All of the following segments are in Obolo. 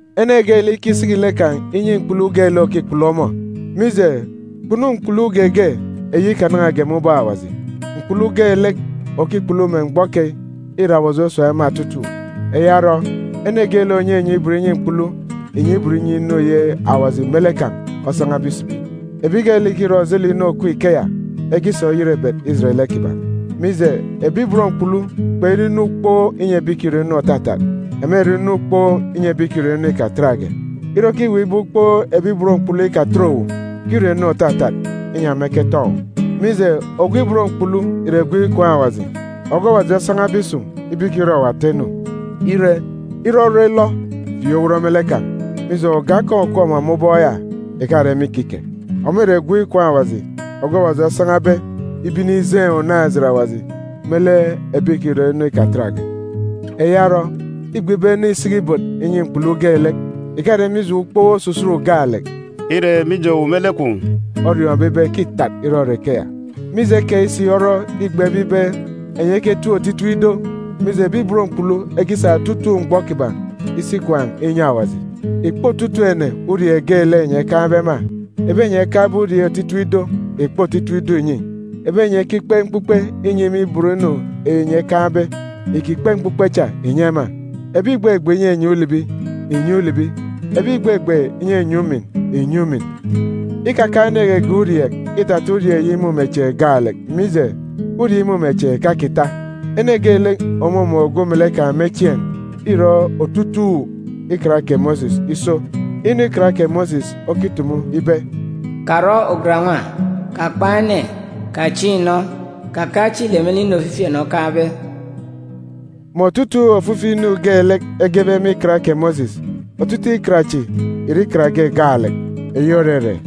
Ene geelek ikisiki lek kan̄ inyi mkpulu geelek òkikpulu ọmọ, mije, kpunu mkpulu geege eyi ikanan̄age me ubọk Awaji. Mkpulu geelek òkikpulu me mgbọ keyi, îre Awaji osun̄ ema otutuuk. Eya orọ, ene geelek ònyenye ibot inyi mkpulu ìnye ibot inyi inu eyi Awaji me lek kan̄ osan̄abe isibi. Ebi geelek ìkirọ ojelek inu òkup ikeya, ekisa oyerebet ijet lek kiban̄. Mije, ebi ibot mkpulu kpere inu ukpook inyi ebi ìkirọ inu òtatat. Ema ìre inu ukpook inyi ebi ìkirọ inu ikatatge. Ire okiweek ibe ukpook ebi ibot mkpulu ikakitet owu, kirọ inu òtatat, inyi ema eketọn̄ owu. Mije, ogwu ibot mkpulu ìre gwun̄ ikwaan̄ Awaji, ogwu Awaji osan̄abe isun̄ ibe ikirọ owu ata inu. Ire, ire orọ ilọ, fieek owot me lek kan̄, mije, oge akọn̄ òkup ọmọ me ubọk ya ìkare me ikike. Ọmọ ìre gwun̄ ikwaan̄ Awaji ogwu Awaji osan̄abe ibe inijeen̄ unaan̄-ejit Awaji me lek ebi ìkirọ inu ikatatge. Eya orọ, îgbe ibe ene isiki ibot inyi mkpulu geelek. Ìkare mije ukpook osusut gaalek, îre si mije owu me lek kwun̄ oriọọn̄be ibe ke îtat irọrọ ikeya. Mije keyi si orọ îgbebe ibe enyi eketip otitip ido, mije, ebi ibot mkpulu ekisa otutuuk mgbọ kiban̄ isi ikwaan̄ inyi Awaji. Ìkpe otutuuk ene urieek geelek enyi ekaan̄be ema. Ebi enyi ekaan̄be urieek otitip ido, ìkpe otitip ido ìnyi. Ebi enyi ekikpe mkpukpe inyi me ibot inu enyi ekaan̄be, ìkikpe mkpukpe cha ìnyi ema. Ebi ìgbegbe inyinyi ulibi, ìnyi ulibi. Ebi ìgbegbe inyinyi umin, ìnyi umin. Ikakaan̄ ene geege urieek, îtata urieek eyi imumechieen̄ gaalek, mije, urieek imumechieen̄ ìkakita. Ene geelek òmumun̄ ogwu melek kan̄ me chieen̄ îrọ otutuuk Ikan kè Mosis iso. Inu egebe me Ikan kè Mosis ibe, “Karọ ugan-nwa, kakpan̄ ene, kachiin̄ inọ, kakaan̄ ijo ulọk me lek inu ofifi ene okaan̄be,”a mè otutuuk ofifi inu geelek egebe me Ikan kè Mosis, otutuuk ikan chi ìre ikan ge gaalek, eyi òrere: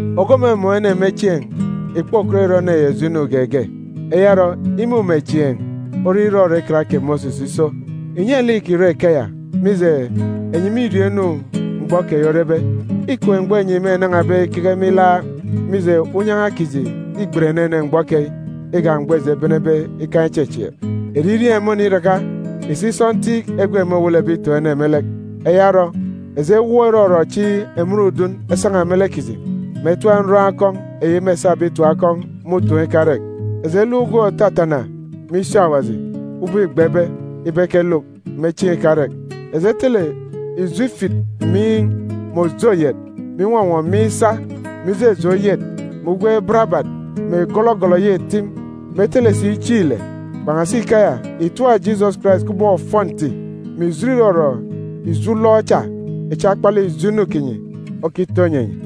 Ogwu òmumun̄ ene me chieen̄ ìkpokọt irọ ene ya ijo inu geege. Eya orọ, imumechieen̄ ore irọrọ Ikan kè Mosis iso. Ìnye lek ìkirọ ikeya, mije, enyi mîriọọn̄ inu mgbọ keyi orebe. Îkem mgbọ enyi mênan̄abe ikeke me ilaak, mije, unyan̄a kiji îgbet enenen mgbọ keyi igak mgbọ eji ebenebe ikaan̄ ichechieek. Eririeen̄ môniraka. Ìsik sọntiik egwe môwelebe itoon̄ ene me lek! Eya orọ, eji ewọọk irọrọ echi emen udun esan̄a me lek kiji, mè etap nroon̄ akọn̄ eyi mêsabe itim akọn̄ me utoon̄ ikarek. Eji eluk ugwem òtatana me isi Awaji ubọk îgbebe ibe ekeluk me chieen̄ ikarek. Eji etele ijo ifit miin̄ mè òje oyet, mè inwọnwọ miin̄ isa, mè ijeje oyet, mè ugwem barabat, mè gọlọgọlọ eyi etim, mè etele si chieen̄ ile. Kpan̄asi ikeya, ìtap Jisọs Karais kubọk ofọnti, mè ìjit irọrọ ijo ulọk cha echi akpalek ijo inu kinyi okitọ inyi enyi.